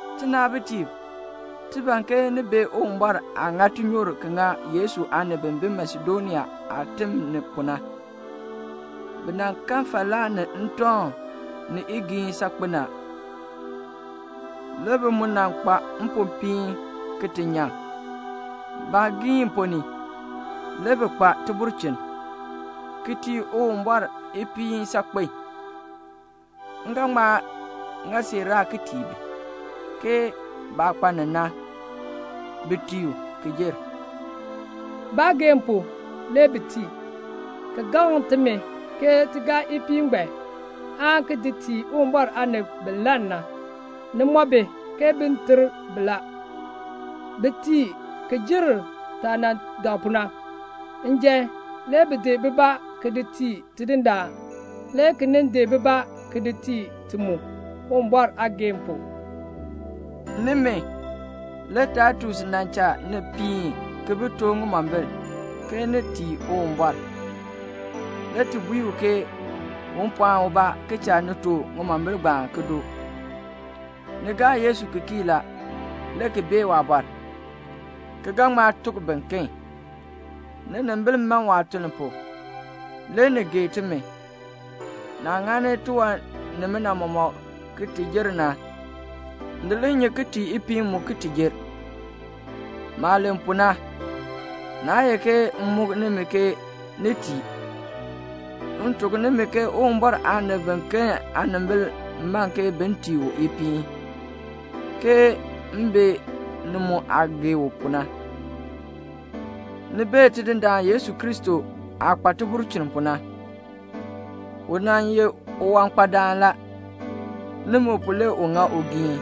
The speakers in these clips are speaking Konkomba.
Tinaabitiib, ti ban ke ni bee Uwumbɔr aah ŋa tinyoor ki ŋa Yesu aanib bi bi Masedonia aatim ni pu na. Bi nan kan falaa ni ntɔŋ ni igiin saakpen a. Le bi mu nan kpa mpopiin ki ti nyaŋ. Baagiin ponn ni, le bi kpa tibulchin, ki tii Uwumbɔr ipiin saakpen. M ga ŋma ŋa siiraa ki tii bi, ke baah kpa ni na, bi tii u, ki jer. Baageehn pu, le bi tii, ki gaŋ timi ke ti gaa ipiin ngbaan, aan ki di tii Uwumbɔr aanib bi lann na. Ni mɔ bi ke bin ter bi la. Bi tii ki jer taah nan dak pu na. Njan, le bi di bibaa ki di tii Tidindaan, le ki nin di bibaa ki di tii ti mu, Uwumbɔr aageehn pu. Nimi, le Taitus nan cha ni piin ki bi too ŋimombil, ke ni tii Uwumbɔr. Le ti bui u ke un pɔɔn ubaa ki cha ni too ŋimombil ngbaan ki doo. Ni gaa Yesu ki kii la, le ki bee waabɔr, ki ga ŋma tuk biken. Ninimbil man waatuln pu. Le ni gee timi. Naah ŋani tiwan nimina mɔmɔk ki ti jer na, ni li nyi ki tii ipiin mu ki ti jer. Maah len pu na, naa ye ke m muk nimi ke ni tii. M tuk nimi ke Uwumbɔr aanib biken aanimbil man ke bin tii u ipiin, ke m bee ni mu aah gee u pu na. Ni bee Tidindaan Yesu Kristo aah kpa tibulchin pu na. U nan ye uwankpadaan la. Nimi pu le u ŋa ugiin.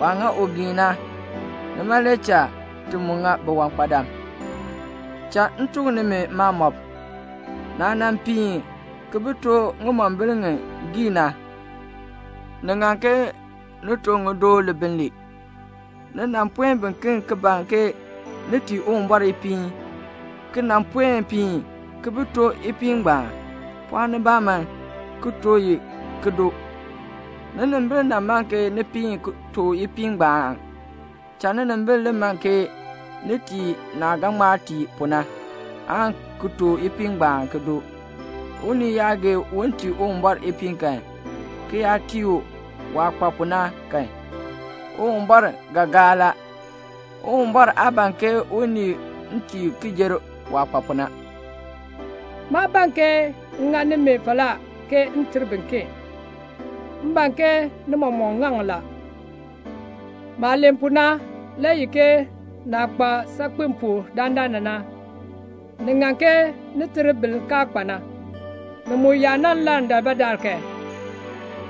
Waah ŋa ugiin na, nima le cha ti mu ŋa biwankpadam. Cha m tuk nimi maamɔb. Naah nan piin ki bi too ŋimombil ŋi giina na, ni ŋan ke ni too ŋi ki doo libiln lee. Ni nan puen biken ki ban ke ni tii Uwumbɔr ipiin, ki nan puen piin ki bi too ipiin ngbaan. Pɔɔn nibaa man ki too i ki doo. Ninimbil nan man ke ni piin ki too ipiin ngbaan. Cha ninimbil li man ke ni tii naah ga ŋma tii pu na, aan ki too ipiin ngbaan ki doo. Unii yaa gee un tii Uwumbɔr ipiin kan, ki yaa tii u waah kpa pu na kan, Uwumbɔr ga gaa la. Uwumbɔr aa ban ke unii tii ki jer waah kpa pu na. Maa ban ke m ŋa nimi falaa ke m ter biken. M ban ke ni mɔmɔk ŋaŋ la. Maah len pu na le ye ke naah kpa saakpen pu dandana na, ni ŋan ke ni ter bin kaa kpa na. Ni mu yaa nan lann daalbaadaal kan,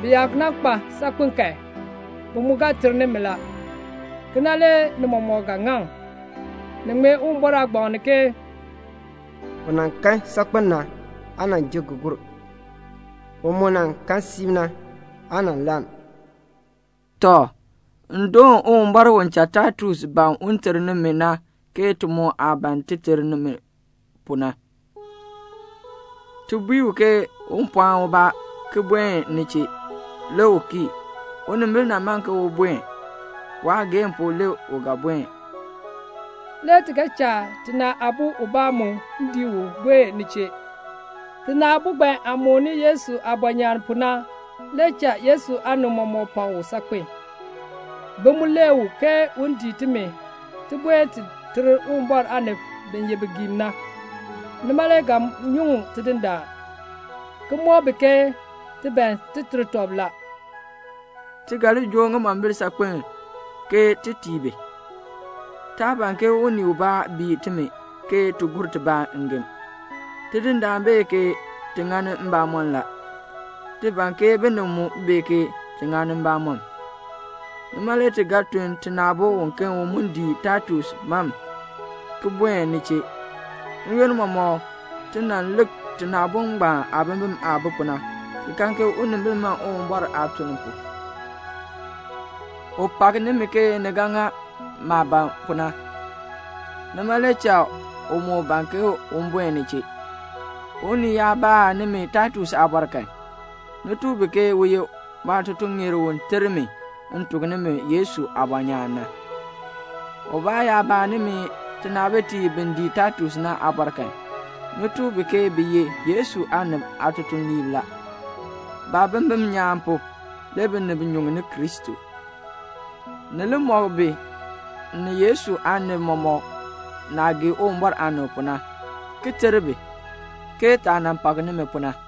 bi yaa nan kpa saakpen kan, bi mu ga ter nimi la. Kena le ni mɔmɔk ga ŋaŋ. Ni ŋmee Uwumbɔr aagbaŋ ni ke "U nan kan saakpen na aa nan ji ki gur. U mu nan kan siib na, aa nan lann." Tɔ, m doon Uwumbɔr u cha Taitus ban un ter nimi na ke ti mu aah ban ti ter nimi pu na. Ti bui u ke un pɔɔn ubaa ki buen ni chee. Le u kii. Unimbil man ke u buen. Waageehn pu le u ga buen. Le ti ga cha tina aabo ubaa mu dii u buen ni chee. Tina aabo ngbaan aah mooni Yesu aabɔnyaan pu na le cha Yesu aanib mɔmɔk pak u saakpen. Bi mu lee u ke un dii timi ti buen ti ter Uwumbɔr aanib bi ye bigiim na. Nima le ga nyuŋ Tidindaan, ki mɔk bi ke ti ban ti ter tɔb la. Ti ga li joo ŋimombil saakpen ke ti tii bi. Taa ban ke unii ubaa bii timi ke ti gur tibaa ngem. Tidindaan bee ke ti ŋani mbamɔm la. Ti ban ke binib mu bee ke ti ŋani mbamɔm. Nima le ti ga tun tina aabo uken u mu dii Taitus mam ki buen ni chee. N-yoonn mɔmɔk ti nan lik tina aabo ngbaan aabimbin aah bi pu na, ki kan ke unimbil man Uwumbɔr aatuln pu. U pak nimi ke ni ga ŋa maah ban pu na, nima le cha u moo ban ke un buen ni chee. Unii yaa baa nimi Taitus aabɔr kan, ni tuk bi ke u ye maatutuŋeer u ter mi m tuk nimi Yesu aabɔnyaan na. Ubaa yaa baa nimi tinaabitiib bi dii Taitus na aabɔr kan, ni tuk bi ke bi ye Yesu aanib aatutuliib la. Baabimbin nyaan pu, le binib nyuŋni Kristo. Ni li mɔk bi ni Yesu aanib mɔmɔk naah gee Uwumbɔr aanib pu na, ki ter bi, ke taah nan pak nimi pu na.